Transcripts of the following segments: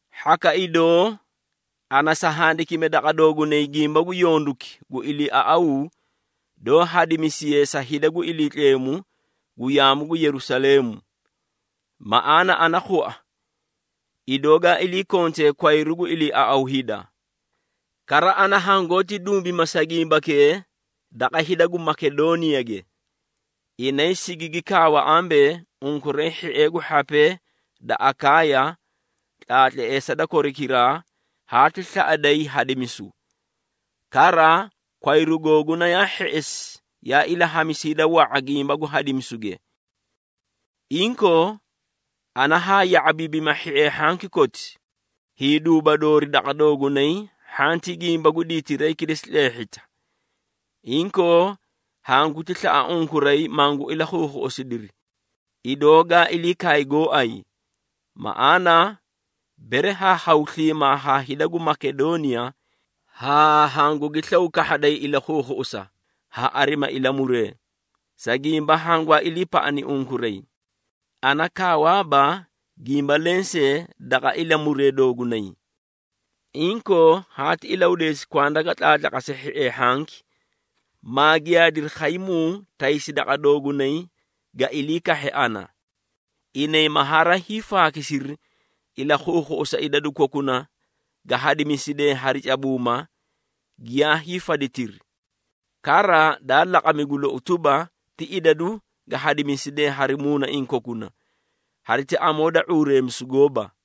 Hhaka idoo, ana sa handikime daqa doogunay gimba gu yonduki gu iliiaꞌaw doó hadimisiye sa hida gu Iliitleemu gu yaamu gu Yerusaleemu. Maꞌaana ana khua, idoo ga ilii kontee kwayru gu iliiaꞌaw hida. Kara ana hangoóti dumbima sa gimbakee daqa hida gu Makedooniyage. Inay sigigi kaawa ambee, unkuray hhiee gu hhapee da Akaaya, tlaatleesa da korikiraa haati slaꞌaday hadimisu. Kara, kwayru googuna yaa hheꞌesi yaa ilahamisi hida wa⁄a gimba gu hadimisuge. Inkoo, ana haa ya⁄abiibima hhiee hhanki koti, hiiduuba doori daqa doogunay hhanti gimba gu diitiray kilesi tleehhita. Inkoo, hanguti slaꞌa unkuray mangu ilakhuukhuꞌusidiri, idoo gaa ilii kaay gooay. Maꞌaana, bere haa khaw sliimaa haa hida gu Makedooniya, haa hangugi slaw kahhaday ilakhuukhuꞌusa, ha arina ilamuree, sa gimba hangwaa iliipaꞌani unkuray. Ana kaawaaba gimba lensee daqa ilamuree doogunay. Inkoo, haati ilahudeesi kwanda ga tlaatlaqase hhiee hhanki, maa giyaadiri khaymuu taysi daqa doogunay ga ilii kahhe ana. Inay ma haraa hiifaakisiri ilakhuukhuꞌusa idadu kokuna ga hadisidee hari cabuuma, giyaa hiifaditiri. Kara, daa laqami gu lou tuba, ti idadu ga hadimisidee hari muunaiĩ kokuna, hariti amoo da ⁄uureemisu gooba.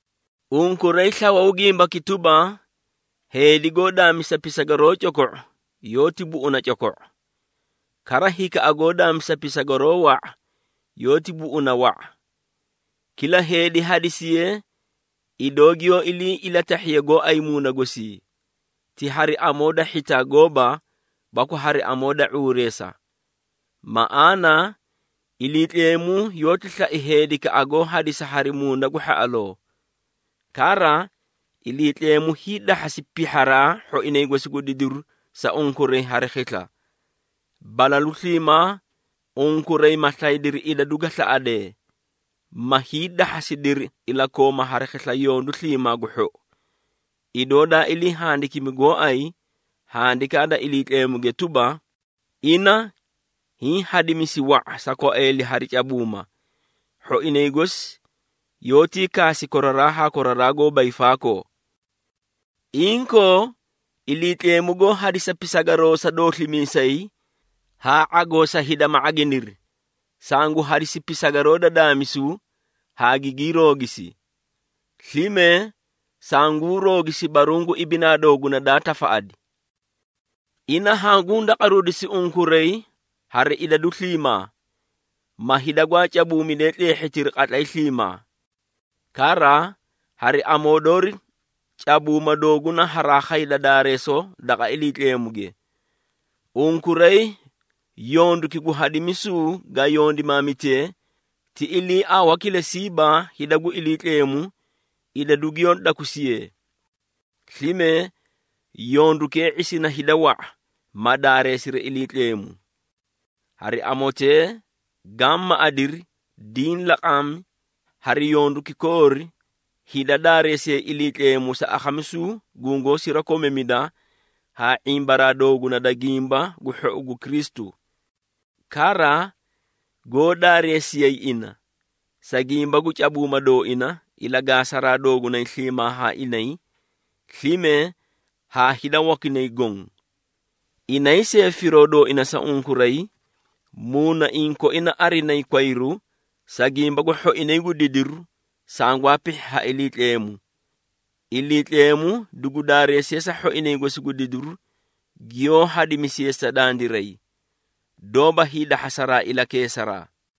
Unkuray slawuu gimbaki tuba, heedi goó daamisa pisagaroo coko⁄o yoóti buꞌuna coko⁄o. Kara hikaꞌa goó daamisa pisagaroo wa⁄a yoóti buꞌuna wa⁄a. Kila heedi hadisiye, idoo giyoó ilii ilatahhiye gooay muuna gosii, ti hari amoo da hhitaa gooba baku hari amoo da ⁄uureesa. Maꞌaana, Iliitleemu yoóti slai heedikaꞌa goó hadisa hari muuna gu hhaꞌaloo. Kara, Iliitleemu hiidahhasi pihharaa hhoinay gosi gu didiru sa unkuray hari khisla. Balalu sliimaa, unkuray ma slaydiri idadu ga slaꞌadee, ma hiidahhasidiri ilakooma hari khisla yondu sliimaa gu hhou. Idoo daa ilii handikimi gooay Handikaa da Iliitleemu tuba, “Ina hiĩ hadimisi wa⁄a sa kwaeeli hari cabuuma. Hhoinay gosi yoótii kaasi koraraa haa koraraa goóba hiifaakoo.” Inkoo, Iliitleemu goó hadisa pisagaroo sa dooslimiisay haa ⁄agoo sa hida ma ⁄aginiri, sangu hadisi pisagaroo da daamisu haa gigii roogisi. Slime, sanguu roogisi baruũ gu ibinaa dooguna daa tafaꞌadi. Ina hanguu daqaruudisi unkuray hari idadu sliimaa, ma hida gwaa cabuumidee tleehhitiri qatlay sliimaa. Kara, hari amoo doori cabuuma dooguna haraa khayda daareesoo daqa Iliitleemuge. Unkuray yonduki gu hadimisuu ga yondimaamitee, ti iliiawa kilesiiba hida gu Iliitleemu idadu giyoó dakusiye. Slime, yondukee ⁄isina hida wa⁄a, ma daareesiri Iliitleemu. Hari amotee gaã maꞌadiri diĩ laqami hari yonduki koori, hida daareesiyay Iliitleemu sa akhamisu gungoó sirakomamida haa ⁄imbaraa dooguna da Gimba gu Hhou gu Kristu. Kara, goó daareesiyay ina, sa gimba gu cabuuma dooina, ilagaasaraa doogunay sliimaa haa inay, slime haa hida wakinay goõ. Inay see firoo dooinay sa unkuray, muunaiĩ koina arinayi kwayru, sa gimba gu hhoinay gu didiru sangwaa pihhi ha Iliitleemu. Iliitleemu dugu daareesiye sa hhoinay gosi gu didiru giyoó hadimisiye sa dandiray, doóba hiidahhasaraa ilakeesaraa!